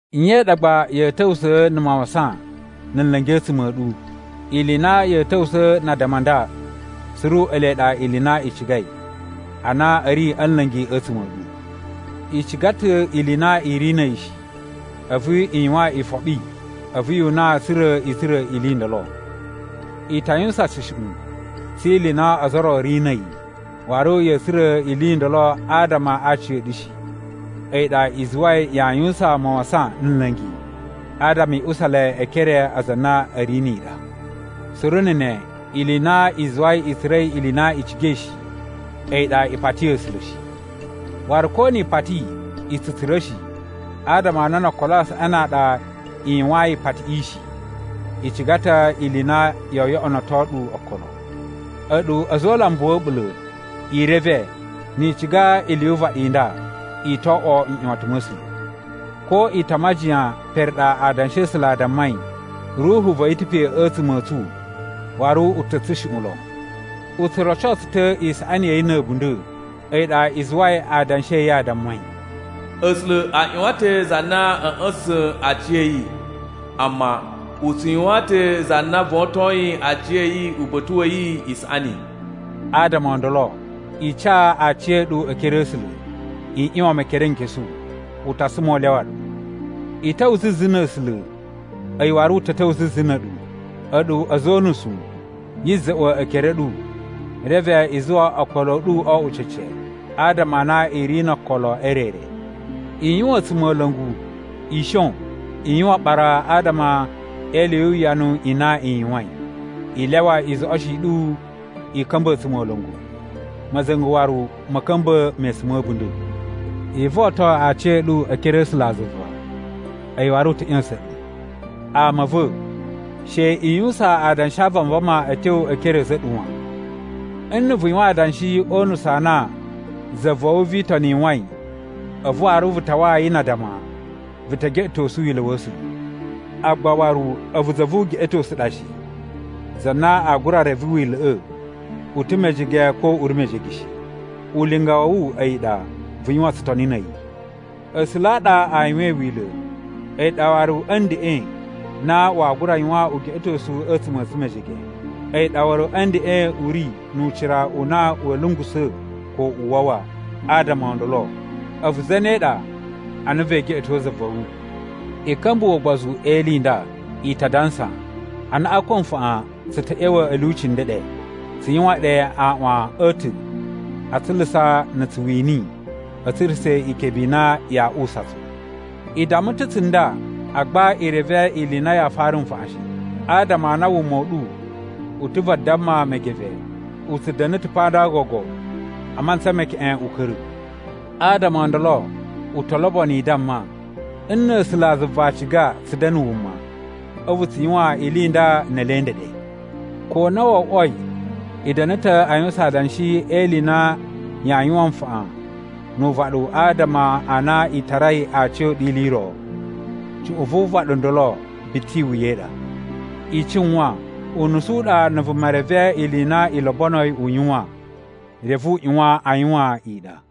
Nye i ɗa gba ya̱a̱ ta̱wusa̱a̱ na̱ mawasan na̱ nla̱ngi a̱tsuma̱ a̱ ɗu? Ili i na ya̱a̱ ta̱wusa̱ na addama a nda suru ele ɗa ili i na i cigai, a na a̱ ri a̱ nla̱ngi a̱tsuma̱ a̱ ɗu. I ciga ta̱ ili i na i ri na̱ a̱yi shi, a̱vu i yuwan ifoɓi a̱vu yu una tsa̱ra̱ i tsura̱ ili i ndolo. I ta yuwusan tsushuꞌun tsi ili i na ozo o ro a̱ ri na̱ a̱yi, waru ya̱a̱ tsura̱ ili i ndolo adama a aciya̱ɗu shi, a̱yi ɗa i zuwai yaa yuwusan mawasan na̱ nla̱ngi adama i usa le e ekere a aza a na a̱ ri ni i ɗa. Suru na̱ ne, ili i na i zuwai i tsura̱i ili i na i cigai shi, a̱yi ɗa, i pati A̱sula̱ shi. Waru ko ni i pati, i tsu tsura̱ shi adama a na no okolo a saꞌani a ɗa i yuwayin ipatiꞌi shi, i ciga ta̱ ili i na yoo yoꞌonoto ɗu okolo. A̱ɗu a̱za̱ o ulambu wa̱ a̱ɓula̱! I reve, ni i ciga ili yu uvaɗi i nda, i to oꞌwo nꞌyuwatan ma̱ A̱sula̱. Ko i ta majiyan pere ɗa Adanshi a̱ A̱sula̱ a dammai, Ruhu va̱ yi ta̱ pe a̱tsuma̱ a̱ tsu waru u ta̱ a̱ tsushuꞌun lon. U tsu roco tsu ta̱ isaꞌani ya̱ yi na̱ a̱bunda̱. A̱yi ɗa i zuwai adanshi a̱ yi a dammai: “A̱sula̱ a ꞌyuwan ta̱ za na a̱ ꞌya̱sa̱sa̱n aciya̱yi, amma u tsu yuwaan ta̱ za na votoyin aciya̱yi uba̱ta̱ wa̱ yi isaꞌani.” Adama o ndolo, i ca aciya̱ɗu e ekere a̱ A̱sula̱. I ꞌyuwan Mekerenkesu, u ta suma u lyawa ɗu. I ta̱wa̱ zuzu na̱ A̱sula̱, a̱yi waru u ta̱ ta̱wa̱ zuzu na̱ a̱ɗu. A̱ɗu a̱za̱ o unusu, yi za̱ꞌwa̱ ekere a̱ ɗu, reve i zuwa okolo a̱ ɗu o oꞌwo cece. Adama a na i ri no okolo e re re. I yuwan a̱tsumola̱ngu, i shon, i yuwan aɓara adama e ili yu uwuyanu i na i yuwain. I lyawa izoꞌoshi i ɗu i ka̱mba̱ a̱tsumola̱ngu, ma̱za̱nga̱ waru ma̱ ka̱mba̱ mesun ma̱ a̱bunda̱. I voton aciya̱ɗu e ekere a̱ A̱sulazuva, a̱yi waru u ta̱ ꞌya̱sa̱n ɗu. Ama a̱ va̱, she i yuwusan adanshi a vanvama a̱ tyo e ekere a̱ a̱za̱ a̱ ɗu wan. Nna̱ vu yuwan adanshi o unusu a na za va̱ wu vi itoni yuwain, a̱vu waru vu tawaa yi na addama, vu te geꞌetosu Wila̱ wa̱ A̱sula̱. Agba waru a̱vu za vu ugeꞌetosu ɗa shi, za na aa gura reve Wila̱ꞌa̱ u ta̱ mejege ko u ri mejege shi. Ulinga wa̱ wu a̱yi ɗa vu yuwan tsutoni na̱ a̱yi. A̱sula̱ a ɗa a yuwain Wila̱, a̱yi ɗa waru a̱ ndeꞌen na waa gura yuwan ugeꞌetosu a̱tsuma̱ a̱ tsu mejege. A̱yi ɗa waru a̱ ndeꞌen u ri nu ucira u na wa̱a̱ lungusa̱ ko u wawa. Adama o ndolo, a̱vu zane ɗa a na vee geꞌeto za va̱ wu? I ka̱mbuwa̱ ugbozu e ili i nda, i ta dansa, “Anaꞌan ko nfaꞌan tsu ta̱ ꞌya̱wa̱ a̱ lyuci ndeɗe, tsu yuwan ɗe aaꞌwan a̱ ta̱ a tsulusa na̱ tsu wini a̱ tsurusa̱ ikebe i na yaa uwusa tsu.” I damma ta̱ tsunda, agba i reve ili i na yaa fara nfaꞌan shi. Adama a na wuma u ɗu u ta̱ vadamma megeve. U tsu da̱na̱ ta̱ pa nda gogo a mantsa me keꞌen u ka̱ra̱. Adama o ndolo, u to lobono i damma, “Nna̱ A̱sulazuva a ciga tsu da̱na̱ wuma, a̱vu tsu yuwan ili i nda ne ele ndeɗe.” Ko na wo oꞌwoi, i da̱na̱ ta̱ a yuwusan adanshi e ili i na yaa yuwan nfaꞌan nu uvaɗu adama a na i tarai aciya̱ɗu ili i ro. Cuꞌun vu uvaɗu u ndolo biti iwuya i ɗa. I cuwan, unusu u ɗa na̱ vuma reve ili i na i lobonoi u yuwan, reve u ꞌyuwan a yuwan i ɗa.